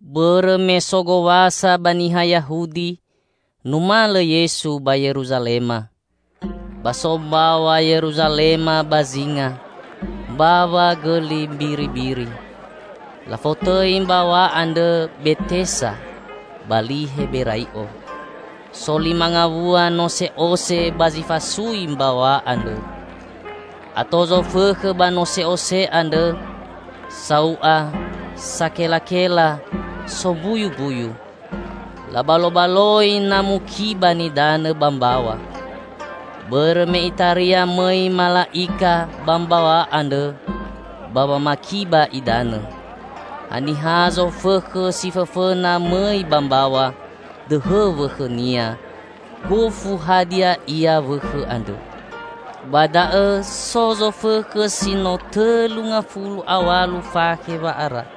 Bõrõ me so Gowasa ba niha Yahudi, numalõ Yesu ba Yeruzalema. Ba so mbaw̃a Yeruzalema ba zinga "Mbawa Gõli Mbiribiri". Lafotõi mbaw̃a andrõ Betesa ba li Heberai'o. So lima ngawua nose'ose ba zi fasui mbaw̃a andrõ. Ato zofõkhõ ba nose'ose andrõ: sau'a, sakelakela, sombuyumbuyu. [Labalobaloi na mukiba nidanõ ba mbaw̃a.] [Bõrõ me itaria mõi mala'ika ba mbaw̃a andrõ ba wamakiba idanõ. Haniha zofõkhõ si fõfõna mõi ba mbaw̃a, dõhõ wõkhõnia, gofu hadia ia wõkhõ andrõ.] Ba da'õ so zofõkhõ si no tõlu ngafulu a w̃alu fakhe wa'ara.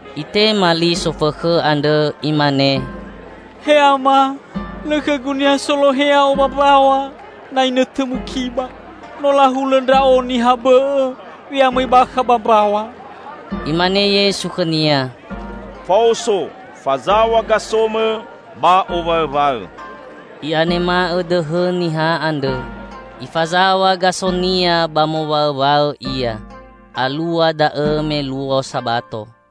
Itema li sofõkhõ andrõ imane, "He Ama, lõ khõgu niha solohe ya'o ba mbaw̃a na inõtõ mukiba, no lahulõ ndra'o niha bõ'õ we'amõi bakha ba mbaw̃a." Imane Yesu khõnia, "Faoso, fazaw̃a gasomõ ba owaõwaõ." I'anema'õ dõhõ niha andrõ. Ifazaw̃a gasonia ba mowaõwaõ ia. Alua da'õ me luo Sabato.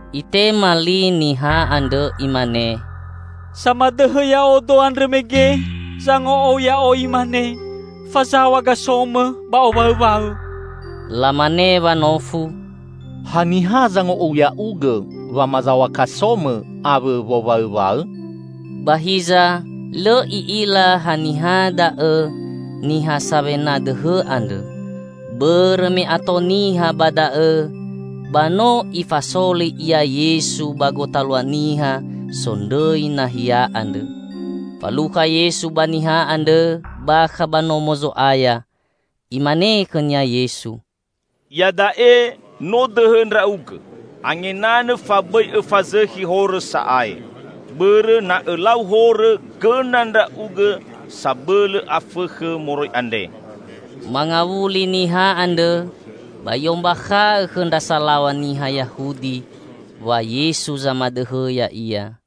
Itema li niha andrõ imane, "Samadõhõ ya'odo andrõ mege zango'ou ya'o imane, 'Fazaw̃a gasomõ ba owaõwaõ.'" Lamane wanofu, "Haniha zango'ou ya'ugõ wamazaw̃a kasomõ awõ wowaõwaõ?" Ba hiza lõ i'ila haniha da'õ niha sawena dõhõ andrõ. Bõrõ me ato niha ba da'õ ba no Ifasoli Ia Yesu ba gotalua niha sondrõi nahia andrõ. Falukha Yesu ba niha andrõ bakha ba Nomo Zo'aya. Imane khõnia Yesu, "Iada'e no dõhõ ndra'ugõ; angenanõ fa bõi õfazõkhi horõ sa'ae. Bõrõ na õlau horõ gõna ndra'ugõ sabõlõ afõkhõ moroi andre." Mangawuli niha andrõ ba i'ombakha'õ khõ ndra salaw̃a niha Yahudi wa Yesu zamadõhõ ya'ia.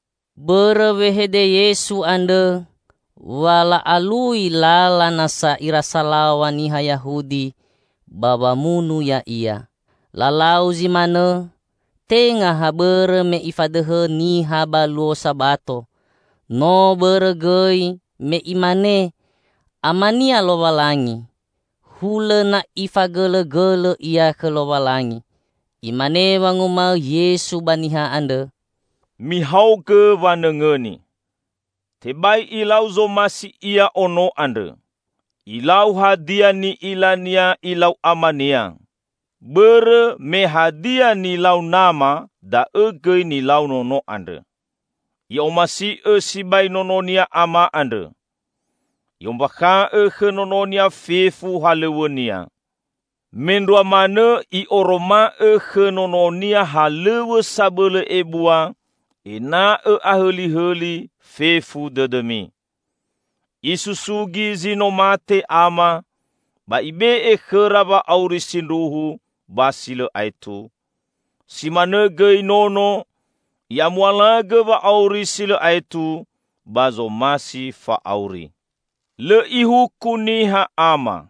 Bõrõ wehede Yesu andrõ wa la'alui lala nasa ira salaw̃a niha Yahudi ba wamunu Ya'ia. Lalau zi manõ tenga ha bõrõ me Ifadõhõ niha ba luo Sabato; no bõrõ gõi me Imane Ama-Nia Lowalangi; hulõ na Ifagõlõgõlõ Ia khõ Lowalangi. Imane wanguma'õ Yesu ba niha andrõ, "Mihaogõ wanõngõni: Tebai Ilau zomasi Ia Ono andrõ. Ilau hadia ni'ila-Nia Ilau Ama-Nia. Bõrõ me hadia nilau Nama da'õ gõi nilau Nono andrõ. I'omasi'õ sibai Nono-Nia Ama andrõ. I'ombakha'õ khõ Nono-Nia fefu halõw̃õ-Nia. Mendrua manõ I'oroma'õ khõ Nono-Nia halõw̃õ sabõlõ ebua ena'õ ahõlihõli fefu dõdõmi. Isusugi zi no mate Ama, ba Ibe'e khõra wa'auri sindruhu ba si lõ aetu; si manõ gõi Nono, I'amualagõ wa'auri si lõ aetu ba zomasi fa'auri. Lõ Ihuku niha Ama.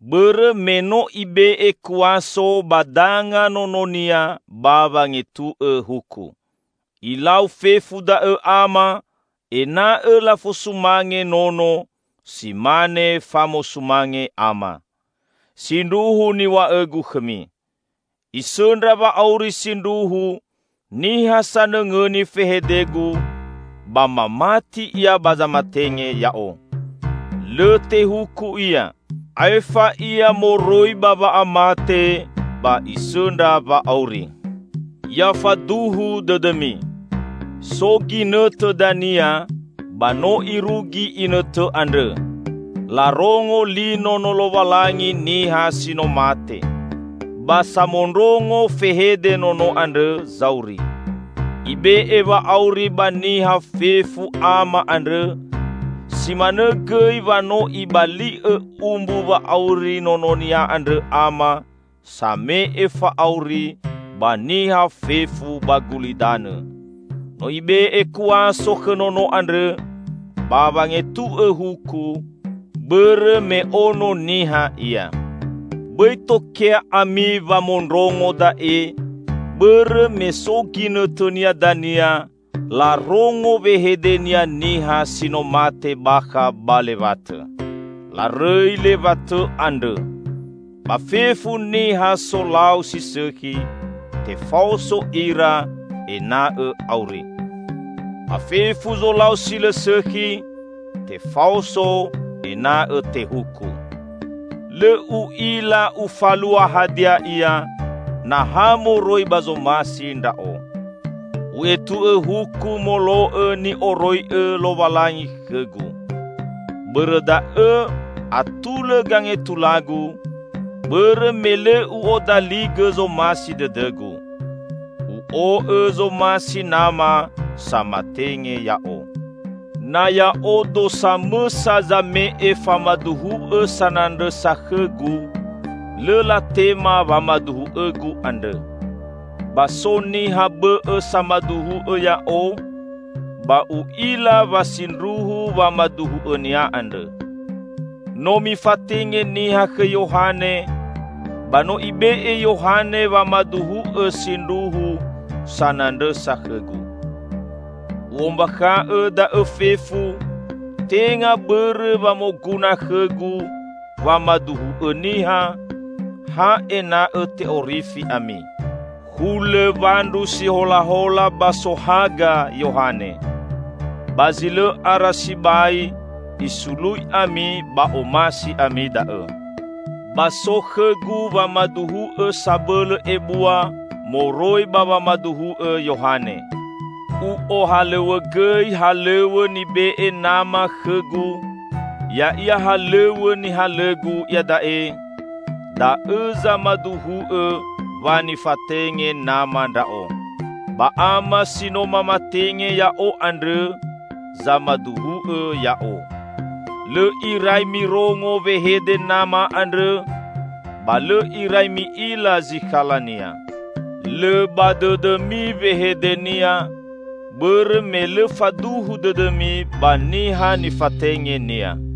Bõrõ me no Ibe'e kuaso ba danga Nono-Nia ba wangetu'õ huku. Ilau fefu da'õ Ama ena'õ lafosumange Nono si mane famosumange Ama. Sindruhu niw̃a'õ-Gu khõmi: Isõndra wa'auri sindruhu niha sanõngõni fehede-Gu ba mamati Ia ba zamatenge Ya'o. Lõ tehuku ia; aefa ia moroi ba wa'amate ba isõndra wa'auri. Ya faduhu dõdõmi: So ginõtõ dania -- ba no irugi inõtõ andrõ -- larongo li Nono Lowalangi niha si no mate. Ba samondrongo fehede Nono andrõ zauri. Ibe'e wa'auri ba niha fefu Ama andrõ; si manõ gõi wa no Ibali'õ umbu wa'auri Nononia andrõ Ama same'e fa'auri ba niha fefu ba gulidanõ! No Ibe'e kuaso khõ Nono andrõ ba wangetu'õ huku, bõrõ me Ono Niha Ia. Bõi tokea ami wamondrongo da'e bõrõ me so ginõtõnia dania larongo wehede-Nia niha si no mate bakha ba lewatõ. Larõi lewatõ andrõ. Ba fefu niha solau si sõkhi tefaoso ira ena'õ auri. Ba fefu zolau si lõ sõkhi tefaoso ena'õ tehuku." "Lõ U'ila Ufalua hadia ia na ha moroi ba zomasi Ndra'o. U'etu'õ huku molo'õ ni'oroi'õ Lowalangi khõ-Gu. Bõrõ da'õ atulõ gangetula-Gu, bõrõ me lõ U'odaligõ zomasi dõdõ-Gu. U'o'õ zomasi Nama samatenge Ya'o. Na Ya'odo samõsa zame'e famaduhu'õ sanandrõsa khõ-Gu, lõ latema wamaduhu'õ-Gu andrõ. Ba so niha bõ'õ samaduhu'õ Ya'o, ba U'ila wa sindruhu wamaduhu'õnia andrõ. No mifatenge niha khõ Yohane ba no ibe'e Yohane wamaduhu'õ sindruhu sanandrõsa khõ-Gu. U'ombakha'õ da'õ fefu, tenga bõrõ wa moguna khõ-Gu wamaduhu'õ niha, ha ena'õ te'orifi ami. Hulõ wandru si holahola ba sohaga Yohane. Ba zi lõ ara sibai isului ami ba omasi ami da'õ. Ba so khõ-Gu wamaduhu'õ sabõlõ ebua moroi ba wamaduhu'õ Yohane. U'ohalõw̃õgõi halõw̃õ nibe'e Nama khõ-Gu -- ya'ia halõw̃õ nihalõ-Gu iada'e -- da'õ zamaduhu'õ wa nifatenge Nama ndra'o. Ba Ama si no mamatenge Ya'o andrõ zamaduhu'õ Ya'o. Lõ irai mirongo wehede Nama andrõ, ba lõ irai mi'ila zikhala-Nia. Lõ ba dõdõmi wehede-Nia, bõrõ me lõ faduhu dõdõmi ba Niha nifatenge-Nia.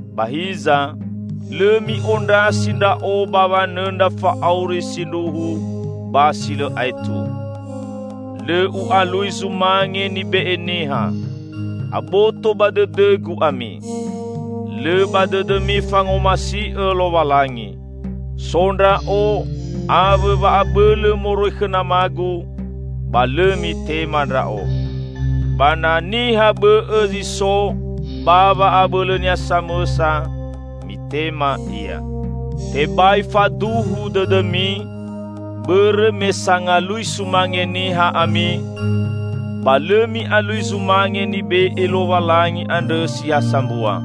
Ba hiza, lõ mi'ondrasi Ndra'o ba wanõndra fa'auri sindruhu ba si lõ aetu. Lõ U'alui zumange nibe'e niha. Aboto ba dõdõ-Gu ami. Lõ ba dõdõmi fangomasi'õ Lowalangi. So Ndra'o awõ wa'abõlõ moroi khõ Namagu, ba lõ mitema Ndra'o. Ba na niha bõ'õ zi so ba wa'abõlõnia samõsa, mitema ia. Tebai faduhu dõdõmi, bõrõ me sangalui sumange niha ami, ba lõ mi'alui zumange nibe'e Lowalangi andrõ si ha sambua.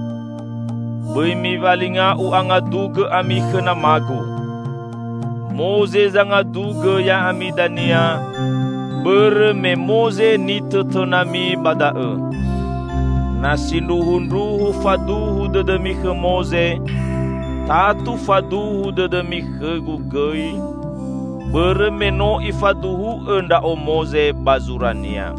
Bõi miwalinga U'angadugõ ami khõ Nama-Gu. Moze zangadugõ ya'ami dania -- bõrõ me Moze nitõtõnami ba da'õ. Na sindruhundruhu faduhu dõdõmi khõ Moze, tatu faduhu dõdõmi khõ-Gu gõi, bõrõ me no ifaduhu'õ ndra'o Moze ba zurania.